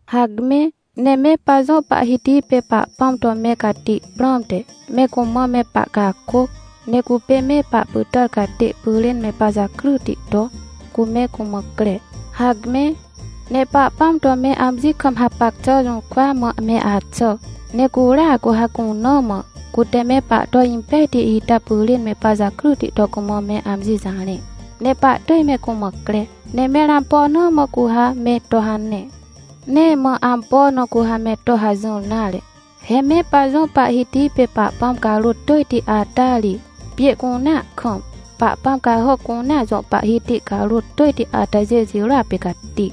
Hacme, ne me pajõ Pahhiti pê Pahpãm to me cati prãmte, me cumã me pahcakôc! Ne cupê me pahpytàr catê pyrên me pajakryti to, cu me cumã cre! Hacme, ne Pahpãm to me amji kam hapac xà jũrkwa mã me axà! Ne curia cu ha cuna mã, cute me pahto impejti ita pyrên me pajakryti to cumã me amji jarẽ, ne pahtỳj me cumã cre! Ne mẽr ampo na mã cu ha me to hane? Nee mã ampo na cu ha me to hajỹr nare. He me pajõ Pahhiti pê Pahpãm carôt tỳjti ata ri, pjê cunea kam, pahpãm cahàc cunea jõ pahhiti carôt tỳjti atajê jirôa pê cati.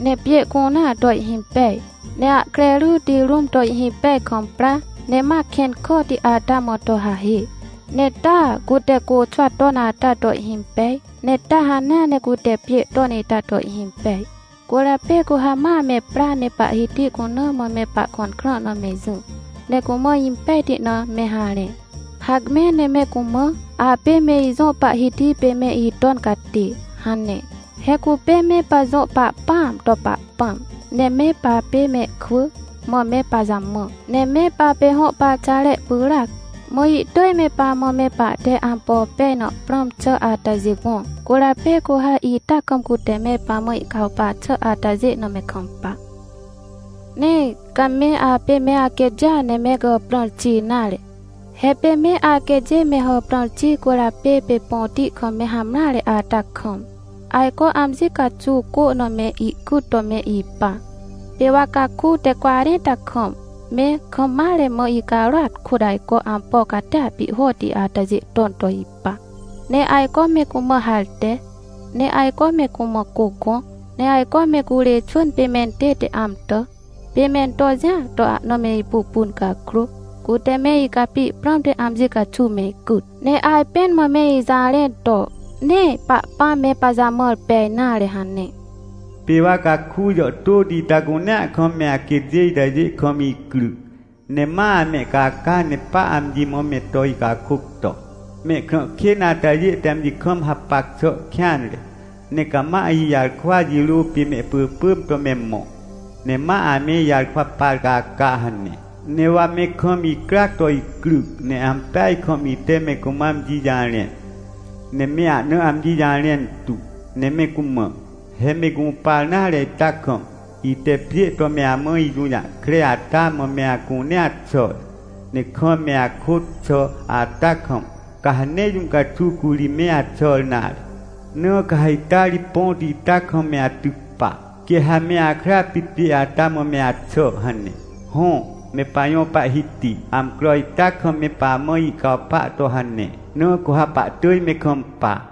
Ne pjê cunea to ihhimpej, ne ahkre ryti rũm to ihhimpej kam pra, ne ma kẽn kàhti ata mã to hahê. Ne taa cute côxwa ton ata to ihhimpej, ne taa hanea ne cute pjê ton ita to ihhimpej. Cwỳrjapê cu ha ma me pra ne Pahhiti cuna mã me pahkõn krã na me jỹ, ne cumã impejti na me harẽ. Hacme ne me cumã: “Apê me ijõ Pahhiti pê me iton catê” hane. He cupê me pajõ Pahpãam to Pahpãm, ne me papê mehkwỳ, mã me pajamã. Ne me papê hõ parxare pyràac, mã ihtỳj me pamã me pahte ampo pej na prãm xà atajê gõ. Cwỳrjapê cu ha ita kam cute me pamã ihcawpa xà atajê na me kampa: “Nee ca me apê me aquêtjêa ne me gàprãr xi nare. He pê me aquêtjê me hàprãr xi cwỳrjapê pê põti kam me hamreare ata kam, ajco amji caxuw cô na me icyt to me ipa. Pê wa caku te cwarẽnta kam, me kam mare mã icarôat kôt ajco ampo catia pihhoti atajê ton to ipa, ne ajco me cumã harte, ne ajco me cumã cô gõ, ne ajco me curê xwỳn pê mentête amtà. Pê mento jĩa to ahna me ipupun cakrô, cute me icapi prãmte amji caxuw me icyt, ne ajpẽn mã me ijarẽn to: ‘Nee Pahpãm me pajamãr pej nare’ hane. Pê wa caku jàhtôti ita cunea kam me aquêtjê itajê kam icryc, ne ma amehcaca ne pa amji mã me to icakôc to: ‘Mehkrã kên atajê te amji kam hapac xà kêanre, ne cama ijarkwa jirô pê mehpỳpỳm to me mõ, ne ma ame ijarkwa par caca’ hane. Ne wa me kam icryac to icryc, ne ampeaj kam ite me cumã amji jarẽn, ne me ahna amji jarẽn tu, ne me cumã: ‘He me gũpar nare ita kam, ite pjê to me amã ijũjahkre ata mã me acunea xàr. Ne kam me akôt xà ata kam, ca ha nee jũ caxuw curi me axàr nare. Na ca ha ita ri põti ita kam me atyc pa, quê ha me akra pit pjê ata mã me axà’ hane”. Hõ, me pajõ Pahhiti, amcro ita kam me pamã ihcawpa to hane, na cu ha pahtỳj me kampa.